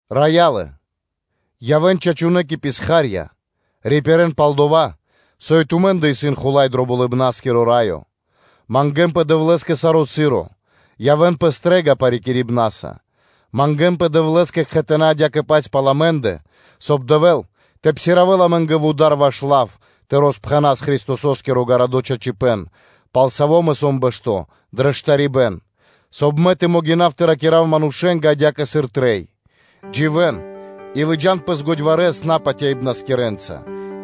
Раялэ, явэ́н чачунэ́ кэ писха́рья (рабы), рипирэ́н пал дова́, со и тумэ́ндэ исын Хула́й дро Болыбна́скиро Раё. Мангэ́нпэ Дэвлэ́скэ саро́ часо, явэ́н пэ стрэ́га парикирибнаса; мангэ́нпэ Дэвлэ́скэ кхэтанэ́ адя́кэ-паць пал амэ́ндэ, соб (кай) Дэвэ́л тэ псиравэл (тэ отпхандэл) амэ́нгэ вуда́р ваш лав тэ роспхэнас Христосо́скиро гарадо́ чачипэ́н, пал саво́ мэ сом бэшто́ дро штарибэ́н, соб (кай) мэ тэ могинав тэ ракира́в манушэ́нгэ, адя́кэ сыр трэй. Дживэ́н и лыджа́н пэс годьварэс напатяибнаскирэнца,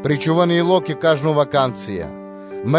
причхувэ́н ило́ кэ кажно ваканцыя (случаё).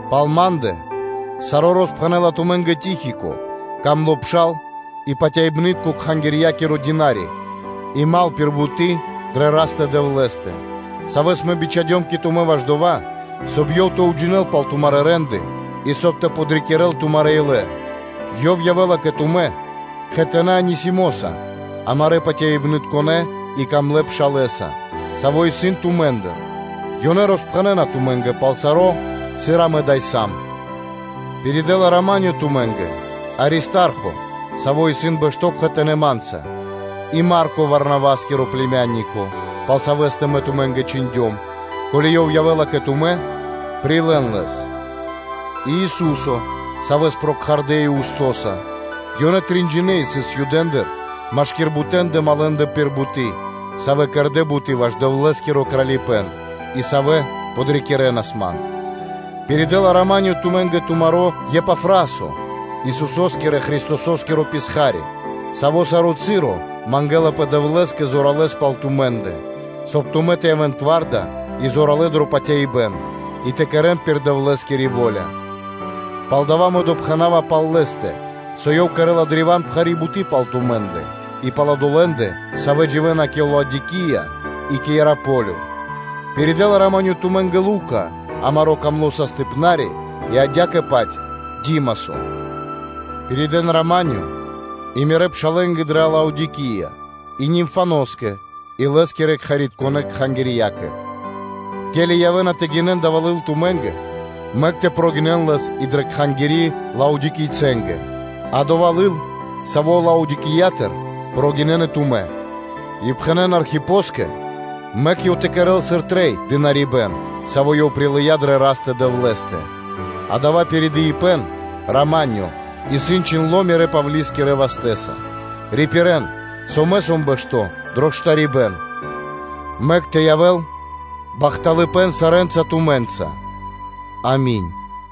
Пал ма́ндэ саро́ роспхэнэ́ла тумэ́нгэ Тихико, дро́го пшал и патяибны́тко кхангирья́киро дына́ри и дру́го (мал) пир буты́ дрэ Растэ-Дэвлэ́стэ, савэ́с мэ бичхадём кэ тумэ́ ваш дова́, соб (кай) ёв тэ уджинэл пал тумарэ́ рэ́нды (де́лы) и, соб (кай) тэ подрикирэ́л тумарэ́ илэ, ёв явэ́ла кэ тумэ́ кхэтанэ́ Анисимоса, амарэ́ патяибнытконэ и дрогонэ́ пшалэса, саво́ исын тумэ́ндыр: ёнэ роспхэнэна тумэ́нгэ пал саро́, сыр амэ ада́й сам. Пиридэла “рамане” тумэ́нгэ Аристархо, саво́ исын бэшто́ кхэтанэ́ ма́нца, и Марко Варнаваскиро плименико (бано), пал савэ́стэ мэ тумэ́нгэ чхиндём; ко́ли ёв явэ́ла кэ тумэ́, прилэ́н лэс, и Ису́со, савэ́с прокхардэ Иусто, ёнэ тринджинэ исын Юдэндыр машки́р бутэндэ малэндэ пир буты́, савэ́ кэрдэ́ буты́ ваш Дэвлэ́скиро Кралипэ́н, и савэ́ подрикирэнас ман. Пиридэла “рама́нё” тумэ́нгэ тумаро́ Епафрасо, Исусо́скирэ-Христосо́скиро писха́ри, саво́ саро́ часо мангэлапэ Дэвлэ́скэ зоралэ́с пал тумэ́ндэ, соб (кай) тумэ́ тэ явэ́н тварда и зоралэ́ дро патяибэ́н и тэ кэрэ́н саро́ пир Дэвлэ́скири во́ля. Палдава́ мэ допхэнава пал лэ́стэ, со ёв кэрэ́ла древа́н пхари́ буты́ пал тумэ́ндэ и пал одолэ́ндэ, савэ́ дживэ́на кэ Лаодикия и кэ Иераполё, пиридэла “рама́нё” тумэ́нгэ Лука, амаро́ дро́го састыпнари (врачо), и адя́кэ-паць Димасо. Пиридэ́н “рама́нё” и мирэ́ пшалэ́нгэ дрэ Лаодикия, и Нимфаноскэ, и лэ́скирэ кхэритконэ́ кхангирьякэ, ке́ли явэ́на тэ гинэн дава́ лыл тумэ́ндэ, мэк тэ прогинэн лэс и дрэ кхангири́ Лаодикийцэнгэ, а дова́ лыл, саво́ Лаодикиятыр, прогинэн и тумэ́. И пхэнэ́н Архипоскэ, мэк ёв тэ кэрэ́л сыр трэй дынарибэ́н, саво́ ёв прилыя́ дрэ Растэ-Дэвлэ́стэ. Дава́ пиридыибэн “рама́нё” исын чхиндло́ мирэ́, Павлискирэ вастэ́са. Рипирэн, со мэ сом бэшто́ дро штарибэ́н. Мэк тэ явэ́л бахталыпэ́н сарэ́нца тумэ́нца. Ами́нь.